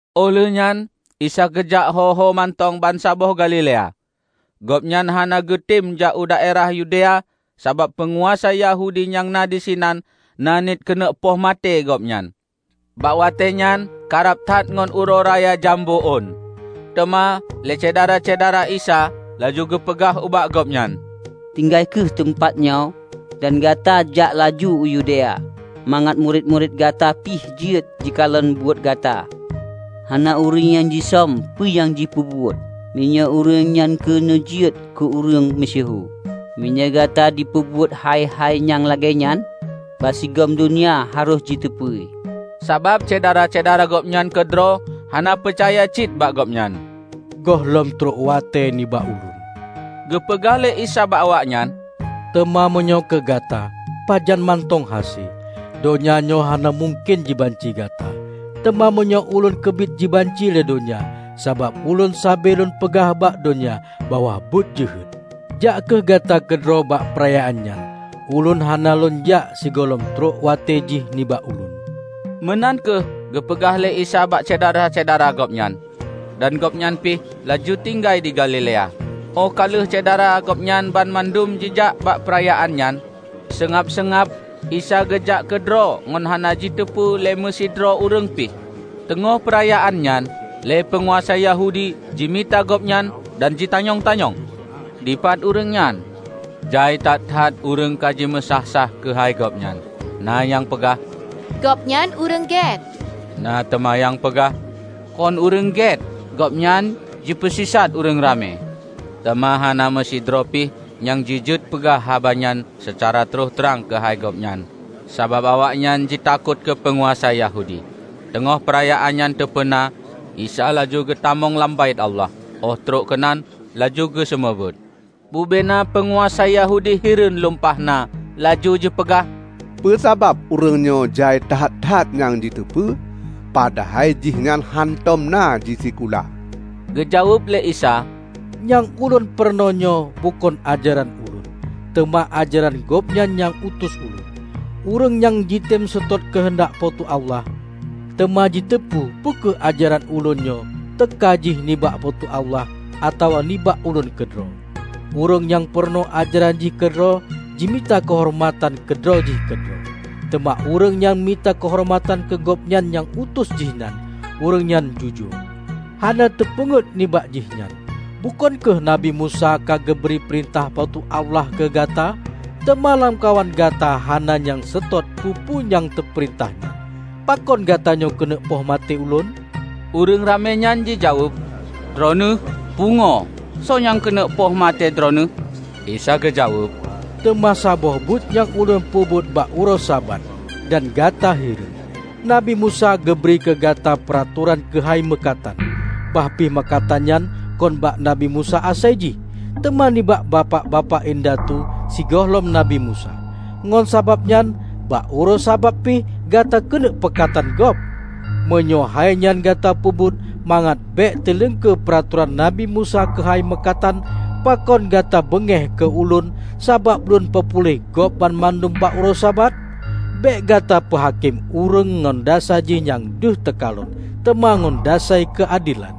Óh lheueh nyan Isa geujak hoho mantong bansaboh Galilea. Gobnyan hana geutem jak u Daerah Yudea sabab peunguasa Yahudi nyang na disinan na niet keuneuk poh maté Gobnyan. Bak watée nyan karab that ngon Uroe Raya Jambo Ôn. Teuma lé syedara-syedara Isa laju geupeugah ubak Gobnyan, "Tinggai kheueh teumpat nyoe dan gata jak laju u Yudea, mangat murit-murit Gata pih jeuet jikalon buet Gata. Hana ureuëng nyang jisöm peue nyang jipeubuet, meunyoe ureuëng nyan keuneuk jeuet keu ureuëng meusyeuhu. Meunyoe gata peubuet hai-hai nyang lagée nyan, bansigom donya harôh jiteupeue!" ( Sabab syedara-syedara Gobnyan keudroe hana peucaya cit bak Gobnyan.) "Gohlom trok watée nibak Ulôn," geupeugah lé Isa bak awaknyan, "teuma meunyoe keu gata, pajan mantong hase. Donya nyoe hana mungken jibanci gata. Teuma meunyoe Ulôn keubiet jibanci lé donya, sabab Ulôn sabe Lôn peugah bak donya bahwa buet jeuhet. Jak kheueh gata keudroe bak peurayaan nyan. Ulôn hana Lôn jak sigohlom trok watée jih nibak Ulôn." Meunan kheueh geupeugah lé Isa bak syedara-syedara Gobnyan, dan Gobnyan pih laju tinggai di Galilea. Óh ka leupah syedara Gobnyan banmandum jijak bak peurayaan nyan, seungab-seungab Isa geujak keudroe ngon hana jiteupeue lé meusidroe ureuëng pih. Teungoh peurayaan nyan, lé peunguasa Yahudi jimita Gobnyan dan jitanyong-tanyong, "Dipat ureuëng nyan?" Jai that-that ureuëng ka jimeusáh-sáh keuhai Gobnyan. Na nyang peugah, "Gobnyan ureuëng gét," na teuma nyang peugah, "Kon ureuëng gét! Gobnyan jipeusisat ureuëng ramé." Teuma hana meusidroe pih nyang jijeuet peugah haba nyan seucara troh trang keuhai Gobnyan sabab awaknyan jitakot keu peunguasa Yahudi. Teungoh peurayaan nyan teupeuna, Isa laju geutamong lam Baét Allah, óh trok keunan laju geuseumeubeuet. Bubena peunguasa Yahudi hireuen lumpah na laju jipeugah, "Peue sabab ureuëng nyoe jai that-that nyang jiteupeue, padahai jihnyan hántom na jisikula?" Geujaweueb lé Isa, "Nyang Ulôn peurunoenyoe bukon ajaran Ulôn, teuma ajaran Gobnyan nyang utus Ulôn. Ureuëng nyang jitem seutôt keuheundak Po teu Allah, teuma jiteupeue peu kheueh ajaran Ulôn nyoe teuka jih nibak Po teu Allah atawa nibak Ulôn keudroe. Ureuëng nyang peurunoe ajaran jih keudroe jimita keuhoreumatan keu droe jih keudroe. Teuma ureuëng nyang mita keuhoreumatan keu Gobnyan nyang utus Jihnyan, ureuëng nyan jujoe, hana nyang teupeunget nibak jihnyan. Bukon kheueh Nabi Musa ka geubri peurintah Po teu Allah keu gata? Teuma lamkawan gata hana nyang seutôt peue-peue nyang teupeurintah nyan. Pakon gatanyoe keuneuk poh maté Ulôn?" Ureuëng ramé nyan jijaweueb, "Droeneueh pungoe! Soe nyang keuneuk poh maté Droeneueh?" Isa geujaweueb, "Teuma saboh buet nyang Ulôn peubuet bak uroe Sabat, dan gata hireuen. Nabi Musa geubri keu gata peuratoran keuhai meukatan -- bah pih meukatan nyan kon bak Nabi Musa asai jih, teuma nibak bapak-bapak indatu sigohlom Nabi Musa. Ngon sabab nyan, bak uroe Sabat pih gata keuneuk peukatan gob. Meunyoe hainyan gata peubuet mangat bék teuiengkeue peuratoran Nabi Musa keuhai meukatan, pakon gata beungéh keu Ulôn sabab Lôn peupuléh gob banmandum bak uroe Sabat? Bék gata peuhakém ureuëng ngon dasai jih nyang deuh teukalon, teuma ngon dasai keuadelan."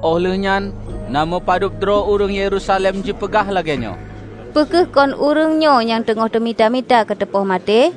Óh lheueh nyan na meupadub droe ureuëng Yerusalem jipeugah lagée nyoe, "Peu kheueh kon ureuëng nyoe nyang teungoh teumita-mita keu teupoh maté?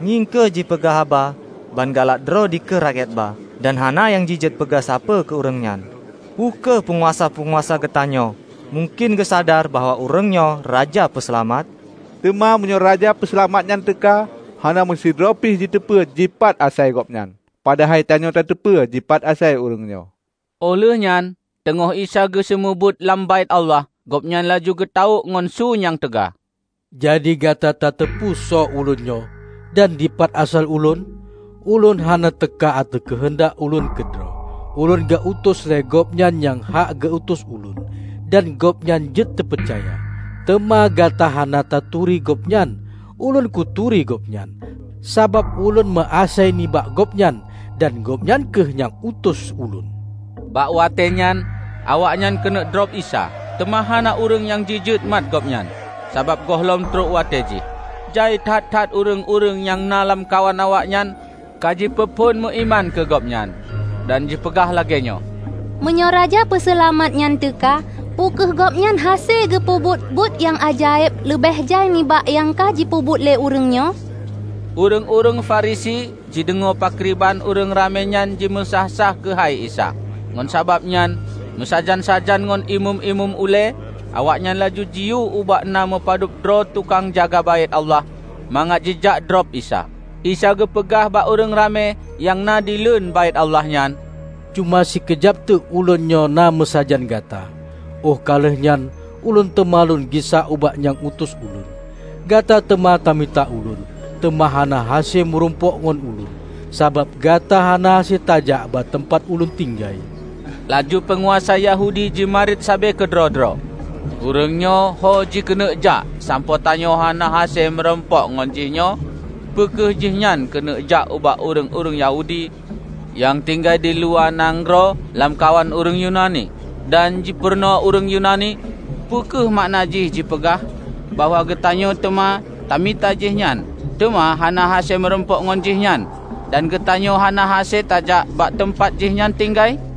Ngieng kheueh jipeugah haba ban galak droe dikeue rakyat ba, dan hana nyang jijeuet peugah sapeue keu ureuëng nyan! Peu kheueh peunguasa-peunguasa geutanyoe mungken geusadar bahwa ureuëng nyoe Raja Peuseulamat? Teuma meunyoe Raja Peuseulamat nyan teuka, hana meusidroe pih jiteupeu dipat asai Gobnyan! Padahai tanyoe tateupeue dipat asai ureuëng nyoe." Óh lheueh nyan, teungoh Isa geuseumeubeuet lam Baét Allah, Gobnyan laju geutawök ngon su nyang teuga, "Jadi gata tateupeue soe Ulôn nyoe, dan dipat asai Ulôn? Ulôn hana teuka ateueh keuheundak Ulôn keudroe. Ulôn geu-utus lé Gobnyan nyang hak geu-utus ulôn, dan Gobnyan jeuet teupeucaya. Teuma gata hana taturi Gobnyan. Ulôn kuturi Gobnyan, sabab Ulôn meuasai nibak Gobnyan, dan Gobnyan kheueh nyang utus Ulôn." Bak watée nyan awaknyan keuneuk drob Isa, teuma hana ureuëng nyang jijeuet mat Gobnyan, sabab gohlom trok watée jih. Jai that-that ureuëng-ureuëng nyang na lamkawan awaknyan ka jipeuphon meuiman keu Gobnyan, dan jipeugah lagée nyoe, "Meunyoe Raja Peuseulamat nyan teuka, peu kheueh Gobnyan hase geupeubuet buet nyang ajaéb leubeh jai nibak nyang ka jipeubuet lé ureuëng nyoe?" Ureuëng-ureuëng Farisi jideungoe pakriban ureuëng ramé nyan jimeusáh-sáh keuhai Isa. Ngon sabab nyan, meusajan-sajan ngon Imeum-imeum ulée, awaknyan laju jiyue ubak na meupadub droeb tukang jaga Baét Allah mangat jijak droe Isa. Isa geupeugah bak ureuëng ramé nyang na dileuen Baét Allah nyan, "Cuma sikeujab teuk Ulôn nyoe na meusajan gata. Óh ka lheueh nyan Ulôn teuma lôn gisa ubak nyang utus Ulôn. Gata teuma ta mita Ulôn, teuma hana hase meurumpok ngon Ulôn; sabab gata hana hase tajak bak teumpat Ulôn tinggai." Laju peunguasa Yahudi jimarit sabe keudroe-droe, "Ureuëng nyoe ho jikeuneuk jak sampoe tanyoe hana hase meurumpok ngon jih nyoe? Peu kheueh jihnyoe keuneuk jak ubak ureuëng-ureuëng Yahudi nyang tinggai di luwa nanggroe lamkawan ureuëng Yunani, dan jipeurunoe ureuëng Yunani? Peu kheueh makna Jih jipeugah bahwa geutanyoe teuma tamita jihnyan teuma hana hase meurumpok ngon jihnyan dan geutanyoe hana hase tajak bak teumpat Jihnyan tinggai?"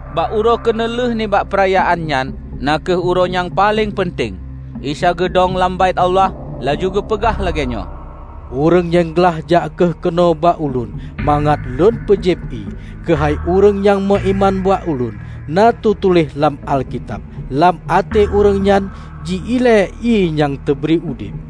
Bak uroe keuneulheueh nibak peurayaan nyan, na kheueh uroe nyang paleng peunteng, Isa geudong lam Baét Allah laju geupeugah lagée nyoe, "Ureuëng nyang glaih jak kheueh keunoe bak Ulôn mangat Lôn peujieb ié. Keuhai ureuëng nyang meuiman bak Ulôn, na teutuléh lam Alkitab, 'Lam até ureuëng nyan ji-ile ié nyang teubri udeb.' " (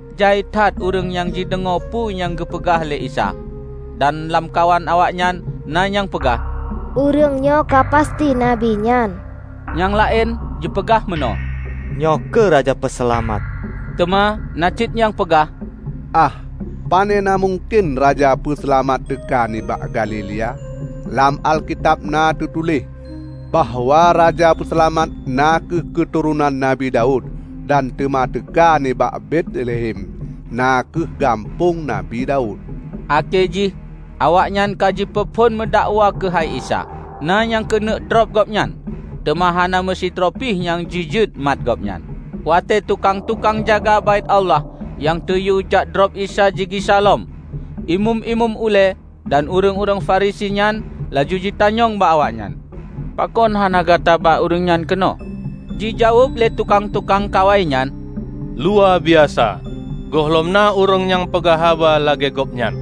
Jai that ureuëng nyang jideungoe peue nyang geupeugah lé Isa, dan lamkawan awaknyan na nyang peugah, "Ureuëng nyoe ka pasti Nabi nyan!" Nyang laén jipeugah meunoe, "Nyoe kheueh Raja Peuseulamat!" Teuma na cit nyang peugah, "Ah, panena mungken Raja Peuseulamat teuka nibak Galilea? Lam Alkitab na teutuléh bahwa Raja Peuseulamat na kheueh keuturonan Nabi Daud dan teuma teuka nibak Betlehem, na kheueh gampông Nabi Daud." Akhé jih awaknyan ka jipeuphon meudakwa keuhai Isa. Na nyang keuneuk drob Gobnyan, teuma hana meusidroe pih nyang jijeuet mat Gobnyan. Watée tukang-tukang jaga Baét Allah nyang teuyue jak drob Isa jigisa lom, Imeum-imeum ulée dan ureuëng-ureuëng Farisi nyan laju jitanyong bak awaknyan, "Pakon hana gata ba ureuëng nyan keunoe?" Jijaweueb lé tukang-tukang kawai nyan, "Luwa biasa, gohlom na ureuëng nyang peugah haba lagée Gobnyan!"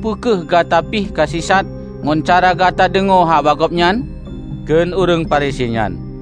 "Peu kheueh gata pih ka sisat ngon cara gata deungoe haba Gobnyan?" kheun ureuëng Farisi nyan.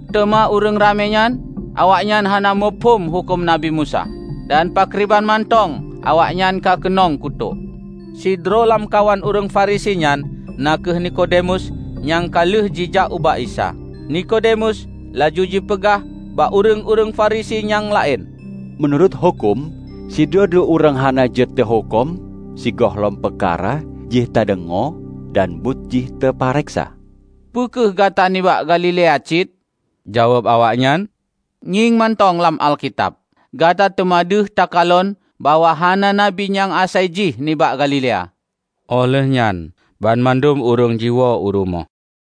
Teuma ureuëng ramé nyan, awaknyan hana muphom huköm Nabi Musa, dan pakriban mantong awaknyan ka keunong kutok." Sidroe lamkawan ureuëng Farisi nyan na kheueh Nikodemus nyang ka lheueh jijak ubak Isa. Nikodemus laju jipeugah bak ureuëng-ureuëng Farisi nyang laén, "Meunurot huköm, sidroe-droe ureuëng hana jeuet teuhuköm sigohlom peukara jih teudeungoe dan buet jih teupareksa." "Peu kheueh gata nibak Galilea cit?" Jaweueb awaknyan, "Ngieng mantong lam Alkitab! Gata teuma deuh takalon bahwa hana nabi nyang asai jih nibak Galilea!" Óh lheuehnyan banmandum ureuëng jiwoe u rumoh.